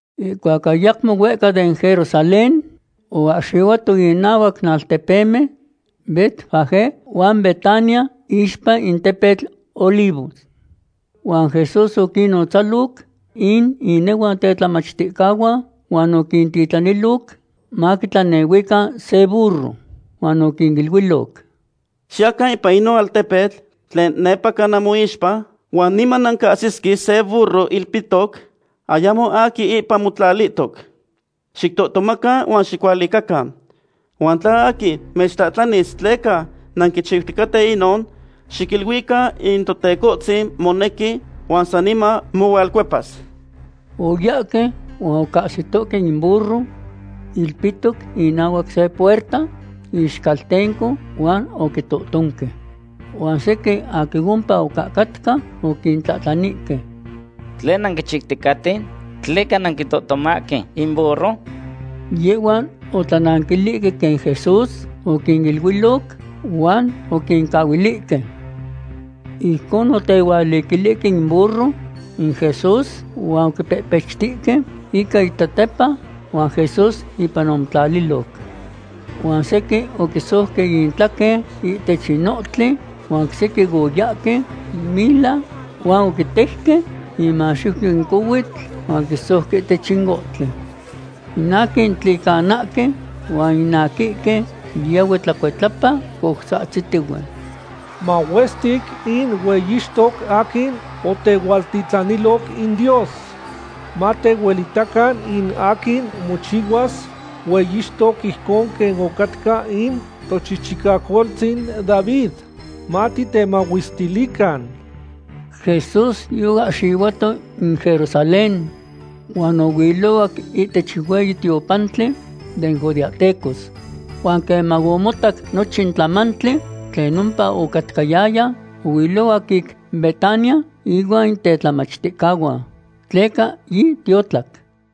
Ihcuac ayacmo huehca den Jerusalén, oahxihuato inahuac in altepemen Betfagé huan Betania iixpa in tepetl Olivos. Huan Jesús oquinnotzaloc in inehuan tetlamachticahuan huan oquintitlanilo maquitlanehuican se burro. Huan oquiniluiloc: ―Xiyacan ipan inon altepetl tlen nepaca namoixpa, huan niman nancahsisque se burro ilpihtoc, ayamo aquin ipan motlalihtoc. Xictohtomacan huan xicualicacan. Huan tla aquin mechtlahtlanis tleca nanquichihuahque inon, xiquiluican in Totecohtzin monequi huan saniman mohualcuepas. Oyahque huan ocahsitohque in burro ilpihtoc inahuac se puerta, ixcaltenco, huan oquitohtonque. Huan sequin aquin ompa ocahcatca oquintlahtlanihque: ―¿Tlen nanquichiuticaten? ¿Tleca nanquitohtomahque in burro? Yehhuan otlananquilihque quen Jesús oquiniluiloc, huan oquincahuilihque. Ijcon otehualiquilihque in burro in Jesús huan oquipehpechtihque ica intetepa, huan Jesús ipan omotlaliloc. Huan sequin oquisouque intlaquen ihtech in ohtli huan oc sequin oyahque mila huan oquitejque inmaxiuyo in cohuitl huan oquisouque ihtech in ohtli. In aquin tlicanahque huan in aquihque yahue tlacuitlapa coutzahtzitihue: ―¡Mahuestic in hueyixtoc aquin otehualtitlaniloc in Dios! Matehuelitacan in aquin mochihuas hueyixtoc ijcon quen ocatca in tochichicacoltzin David. ¡Matitemahuestilican! Jesús yoahxihuato in Jerusalén huan ohuilohuac ihtech in hueyi tiopantli den judeahtecos. Huan queman omotac nochin tlamantli tlen ompa ocatcayaya, ohuilohuac ic Betania ihuan in tetlamachticahuan, tleca yitiotlac.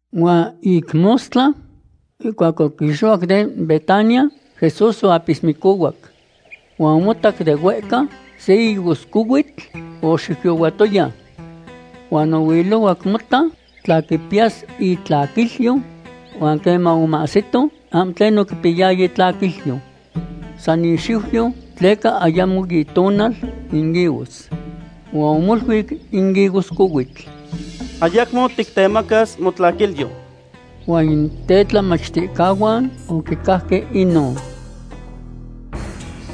Huan ic mostla, ihcuac oquixohuac den Betania, Jesús oapismicohuac. Huan omotac de huehca se higoscohuitl, oxiuyohuatoya. Huan ohuilohuac mota tla quipiyas itlaquilyo, huan queman omahsito, ahmo tlen oquipiyaya itlaquilyo. San ixiuyo, tleca ayamo itonal in higos. Huan omoluic in higoscohuitl: ―Ayacmo tictemacas motlaquilyo. Huan in tetlamachticahuan oquicajque inon.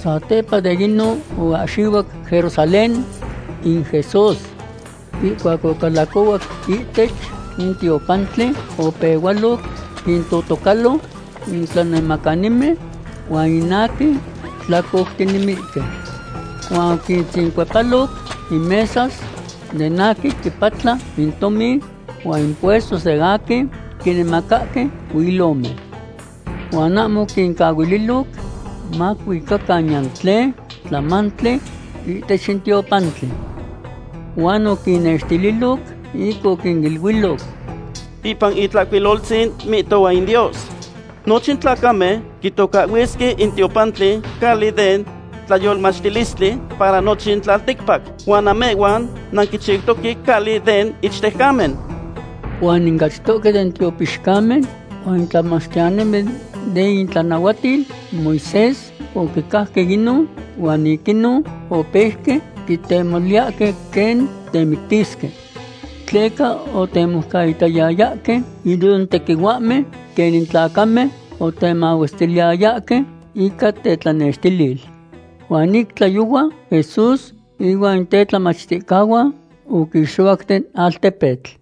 Satepa de inon oahxihuac Jerusalén in Jesús. Ihcuac ocalacohuac ihtech in tiopantli, opehualoc quintotocalo in tlanemacanimen huan in aquin tlacoutinemihque. Huan oquintzincuepaloc in mesas den aquin quipatla in tomin huan in puestos den aquin quinemacahque huilomen. Huan ahmo oquincahuililoc macuicacan niyan tlen tlamamali ihtech in tiopantli. Huan oquinnextililoc ic oquiniluiloc: ―Ipan in Tlahcuiloltzin mihtohua in Dios: “Nochin tlacamen quitocahhuisque in tiopantli cali den tlayolmachtilistli para nochin tlalticpac”, huan namehhuan nanquichiutoque cali den ichtejcamen. Huan in achtohque den tiopixcamen huan in tlamachtiyanimen den itlanahuatil Moisés oquicajque inon, huan ic inon opeuque quitemoliyahque quen temictisque. Tleca otemoucaitayayahque inon tequihuahmen quen in tlacamen otemahuestiliyayahque ican tetlanextilil. Huan ic tlayohua Jesús inuan in tetlamachticahuan oquixohuac den altepetl.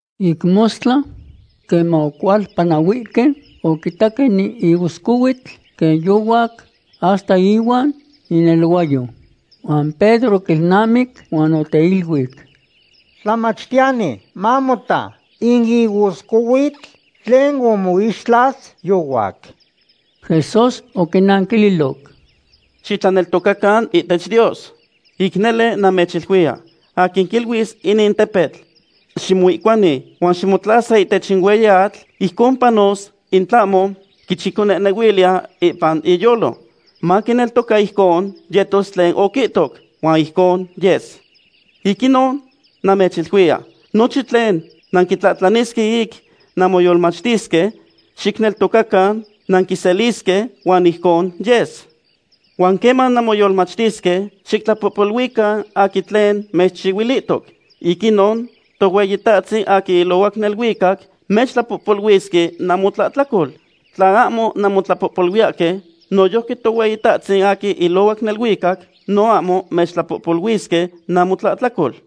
Ic mostla, queman ocualpanahuihque, oquitaque in higoscohuitl quen yohuac hasta ihuan ineluayo. Huan Pedro oquilnamic huan oteiluic: ―Tlamachtiyani, mamota; in higoscohuitl tlen omoixtlas yohuac. Jesús oquinanquililoc: ―Xitlaneltocacan ihtech Dios. Ic nele namechiluiya, aquin quiluis inin tepetl: “Ximoihcuani huan ximotlasa ihtech in hueyi atl”, ijcon panos in tlahmo quichiconehnehuiliya ipan iyolo. Maquineltoca ijcon yetos tlen oquihtoc, huan ijcon yes. Ic inon namechiluiya, nochin tlen nanquitlahtlanisque ic namoyolmachtisque, xicneltocacan nanquiselisque, huan ijcon yes. Huan queman nanmoyolmachtisque, xictlapohpoluican aquin tlen mechchihuilihtoc. Ic inon Tohueyitahtzin aquin ilohuac neluicac mechtlapohpoluisque namotlahtlacol. Tla ahmo nanmotlapohpoluiyahque, noyojqui Tohueyitahtzin aquin ilohuac neluicac no ahmo mechtlapohpoluisque namotlahtlacol.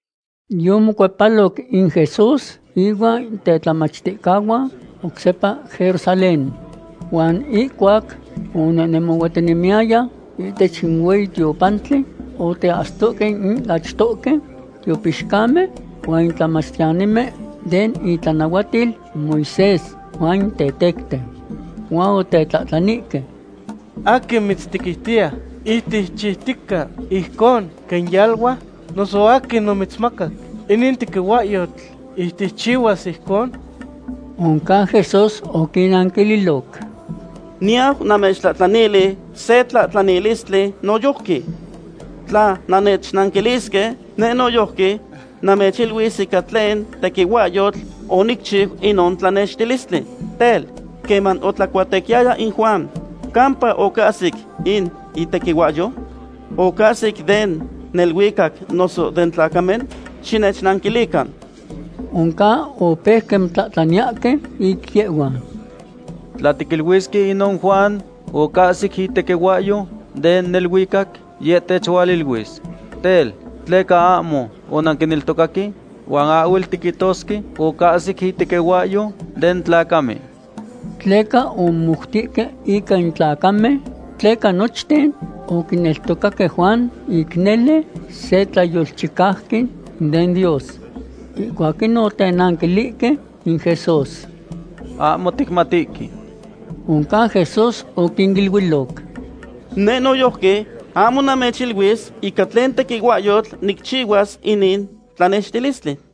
Yomocuepaloc in Jesús inuan in tetlamachticahuan oc sepa Jerusalén. Huan ihcuac onehnemohuatinemiyaya ihtech in hueyi tiopantli, oteahsitohque in achtohque tiopixcamen huan in tlamachtiyanimen den itlanahuatil in Moisés huan in tetecten. Huan otetlahtlanihque: ―¿Aquin mitztequiutiya ic ticchiutica ijcon quen yalua, noso aquin omitzmacac inin tequihuahyotl ic ticchihuas ijcon? Oncan Jesús oquinnanquililoc: ―Niyau namechtlahtlanili se tlahtlanilistli noyojqui. Tla nannechnanquilisque, neh noyojqui namechiluis ica tlen tequihuahyotl onicchiu inon tlanextilistli. Tel, ¿queman otlacuatequiyaya in Juan, campa ocahsic in itequihuahyou? ¿Ocahsic den neluicac noso den tlacamen? ¡Xinechnanquilican! Oncan opeuque motlahtlaniyahque ic yehhuan: ―Tla tiquiluisque inon Juan ocahsic itequihuahyou den neluicac, yeh techualiluis: “Tel, ¿tleca ahmo onanquineltocaque?” Huan ahhuel tiquihtosque ocahsic itequihuahyou den tlacamen. Tleca omomoutihque ica in tlacamen, tleca nochten oquineltocaque Juan ic nele se tlayolchicauqui den Dios. Ihcuac inon otenanquilihque in Jesús: ―Ahmo ticmatihque. Oncan Jesús oquiniluiloc: ―Neh noyojqui ahmo namechiluis ica tlen tequihuahyotl nicchihuas inin tlanextilistli.